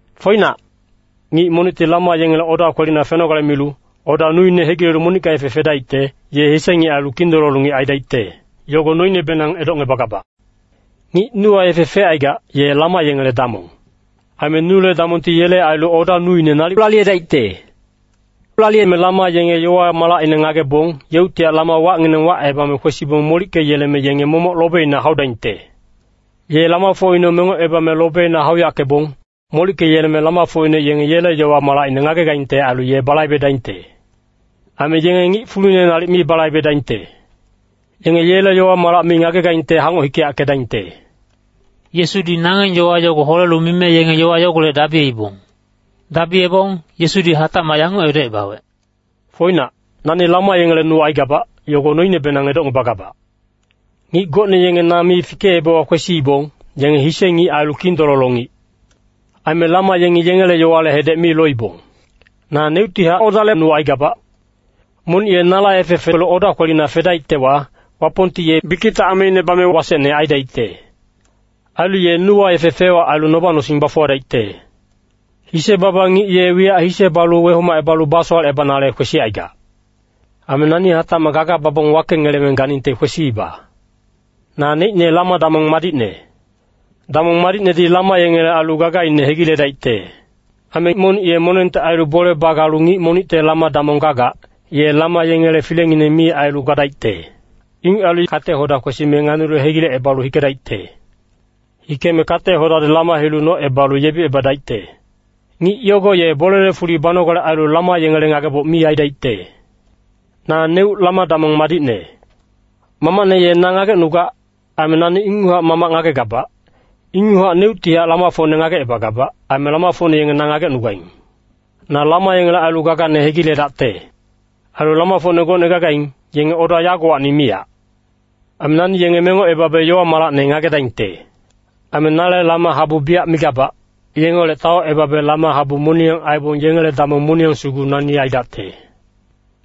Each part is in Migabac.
“Foinac, ngic monicti lama yengele oda kwelina fenogale milu, oda nuine hegilelu monicka yefe fedaicte, ye hise ngic ailu kindololo ngic aidaicte, yogo noinebenang edocngebagabac. Ngic nuwa yefe fecaigac, ye lama yengele damong. Aime nule damongti yele ailu oda nuine nalic laliyedaicte. Laliyeme lama yenge yowa-malacine ngagebong, yeuctihac lama wacnginang wacebame kwesibong molickeyeleme yenge momoc lobeina haudaingte. “Ye lamafocine mengocebame lobeina hauyackebong, molickeyeleme lamafocine yenge yele yowa-malacine ngagegaingte ailu ye balaibedaingte. Aime yenge ngic fulune nalic mi balaibedaingte. Yenge yele yowa-malac mi ngagegaingte hangoc hikeyackedaingte.” Yesudi nangeng yowa yogo holelu mime yenge yowa yogolec dabiyeibong. Dabiyebong, Yesudi hatacmac yanguc edocebawec, “Foinac, nani lama yengele nu aigabac, yogo noinebenang edocngebagabac. Ngic gocne yenge na mi fikeebewa kwesiibong, yenge hise ngic ailu kindololo ngic. Aime lama yengi yengele yowale hedec mi loibong. Naneuctihac odale nu aigabac. Monic ye nala yefe felu oda kwelina fedaictewa, Wapongti ye bikicte ameine bame wasecne aidaicte. Ailu ye nuwa yefe fec-wac ailu noba-nosing bafuwadaicte. Hise-baba ngic ye wiyac hise balu wehomacebalu basowalecebanale kwesicaigac. Aime nani hatacmac gaga babong wakengeleme ganingte kwesiiba. “Naneicne lama-damong madicne. Damong madicnedi lama yengele ailu gagaine hegiledaicte. Aime monic ye monengte ailu bole bagalu ngic monicte lama-damong gagac, ye lama yengele filengineng mi ailu gadaicte. Inguc ailu kate-hoda kwesime nganilu hegilecebalu hikedaicte. Hikeme kate-hodadi lama hilu nocebalu yebicebadaicte. Ngic yogo ye bolele fuli banogale ailu lama yengele ngageboc mi aidaicte. Naneuc lama-damong madicne. Mamacne ye na ngagecnugac. Aime nani inguchac Mamac ngagegabac, ingucnehac neuctihac lamafocne ngagecebagabac. Aime lamafocne yenge na ngagecnugaing. Na lama yengele ailu gagane hegiledacte. “Ailu lamafocne gocne gagaing, yenge oda yagowacni miyac. Aime nani yenge mengocebabe yowa-malacne ngagedaingte. Aime nale lama habu biyac migabac, yengeholec taocebabe lama habu moniyang aibong yengele damong moniyang sugu nani aidacte.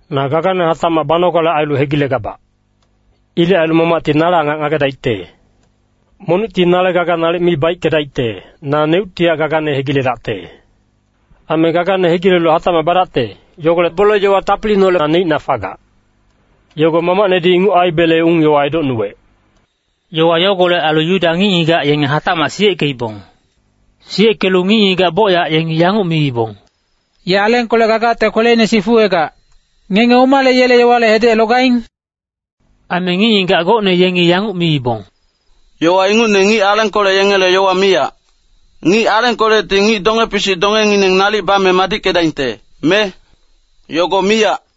Na gagane hatacmac banogale ailu hegilegabac. Ilec ailu Mamacti nale angac ngagedaicte. Monicti nale gaga nalic mi baickedaicte, naneuctihac gagane hegiledacte. Aime gagane hegilelu hatacmac badacte, yogolec bole-yowa tapiliineholec na neicna fagac. Yogo Mamacnedi inguc aibele ung-yowa edocnuwec.” Yowa yogolec ailu Yuda ngic-ngigac yenge hatacmac siyeckeibong. Siyeckelu ngic-ngigac bocyac yengi yanguc miibong, “Ye alengkolec gagacte kweleine sifuwegac. Ngenge omale yele yowale hedec logaing?” Aime ngic-ngigac gocne yengi yanguc miibong, “Yowa ingucne ngic alengkolec yengele yowa miyac. Ngic alengkolecti ngic donge-pisic dongengineng nalic bame madickedaingte, me? Yogo miyac.”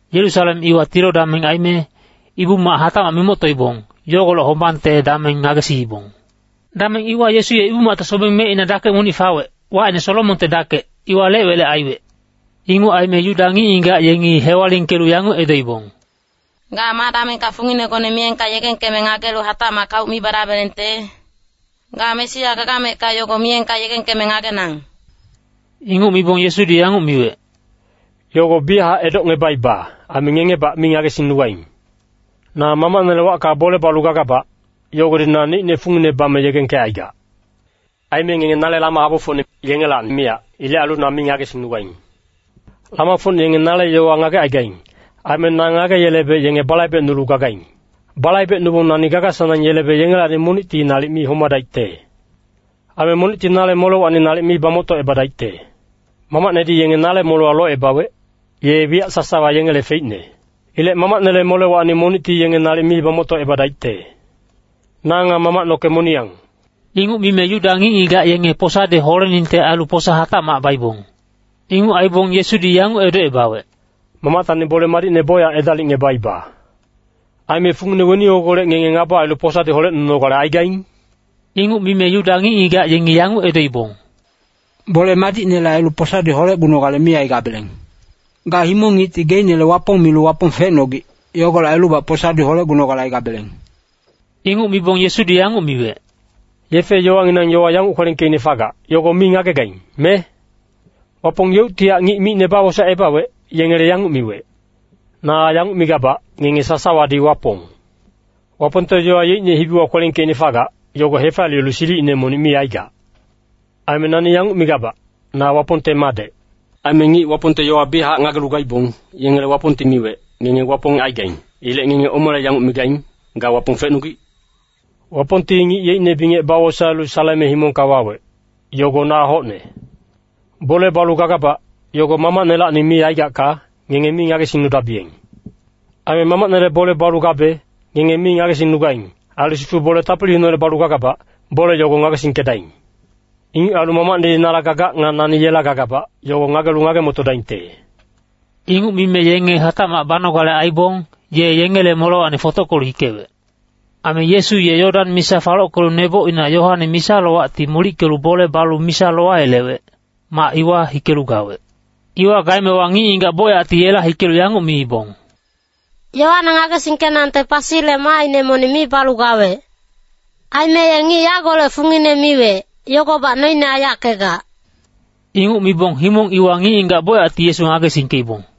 Yerusalem iwa tilo dameng aime, Ibu-mac hatacmac mimoctoibong, yogolec hombangte dameng ngagesiibong. Dameng iwa Yesu ye Ibu-macte sobeng mecina dakec monic fawec, wacine Solomonte Dakec, iwa lec-welec aiwec. Inguc aime Yuda ngic-ngigac yengi hewalingkelu yanguc edoibong, “Ga ma damengka funginegone miyengka yegengkeme ngagelu hatacmac kauc mi badabelengte? Ga Mesia gagamecka yogo miyengka yegengkeme ngagenang.” Inguc mibong Yesudi yanguc miwec, “Yogo biyachac edocngebaiba. Aime ngengebac mi ngagesingnugaing. Na Mamacnele wacka bole balu gagabac, yogodi naneicne fungine bame yegengkecaigac. Aime ngenge nale lama habufocne, yengelacni miyac. Ilec ailu na mi ngagesingnugaing. Lamafocne yenge nale yowa ngagecaigaing. Aime na ngageyelebe yenge balaibecnulu gagaing. Balaibecnubong nani gaga-sanang yelebe yengelacni monicti nalic mi homadaicte. Ailu monicti nale molewacni nalic mi bamoctocebadaicte. Mamacnedi yenge nale molewa locebawec, ye wiyac sasawa yengele feicne. Ilec Mamacnele molewacni monicti yenge nalic mi bamoctocebadaicte. Na nga Mamac noke moniyang.” Inguc mime Yuda ngic-ngigac yengi posadi holeningte ailu posa hatacmac baibong. Inguc aibong Yesudi yanguc edocebawec, “Mamactacni bole madicne bocyac edalicngebaiba. Aime fungine weni yogolec ngenge ngaba ailu posadi holecnunogale aigaing?” Inguc mime Yuda ngic-ngigac yengi yanguc edoibong, “Bole madicnele ailu posadi holecgunogale mi aigabeleng. Ga himong ngicti geicnele Wapong milu Wapong fecnogic. Yogolec ailubac posadi holecgunogale aigabeleng.” Inguc mibong Yesudi yanguc miwec, “Yefe-yowanginang yowa yanguc kwelengkeicne fagac, yogo mi ngagegaing, me? Wapong yeuctihac ngic micne bawosaecebawec, yengele yanguc miwec, ‘Na yanguc migabac, ngenge sasawadi wapong.’ Wapongte yowa yeicne hibiwa kwelengkeicne fagac, yogo hefaliyelu silicine monic mi aigac. Aime nani yanguc migabac, ‘Na Wapongte Madec.’ Aime ngic Wapongte yowa biyachac ngagelu gaibong, yengele Wapongti miwec, ‘Ngenge wapong gagaing.’ Ilec ngenge omale yanguc migaing, ‘Ga Wapong fecnogic’? Wapongti ngic yeicne bingec bawosaelu saleme himongka wawec, yogo na hocne. “Bole balu gagabac, yogo Mamacnelacni mi aigacka, ngenge mi ngagesingnudabiyeng. Aime Mamacnele bole balu gabe, ngenge mi ngagesingnugaing. Ailu sifu bole tapiliineholec balu gagabac, bole yogo ngagesingkedaing. Inguc ailu Mamacnedi nala gagac nga nani yela gagabac, yogo ngagelu ngage-motodaingte.” Inguc mime yenge hatacmac banogale aibong, ye yengele molewacni fotockelu hikewec. Aime Yesu ye Yodan misa falockelu nebocina Yoane misa-lowacti molickelu bole balu misa lowayelewec, mac iwa hikelu gawec. Iwa gaemewa ngic-ngigac bocyacti yela hikelu yanguc miibong, “Yoane ngagesingkenangte pasile maaine monic mi balu gawec. Aime ye ngic yagolec fungine miwec, yogobac noine aiyackegac.” Inguc mibong himong iwa ngic-ngigac bocyacti Yesu ngagesingkeibong.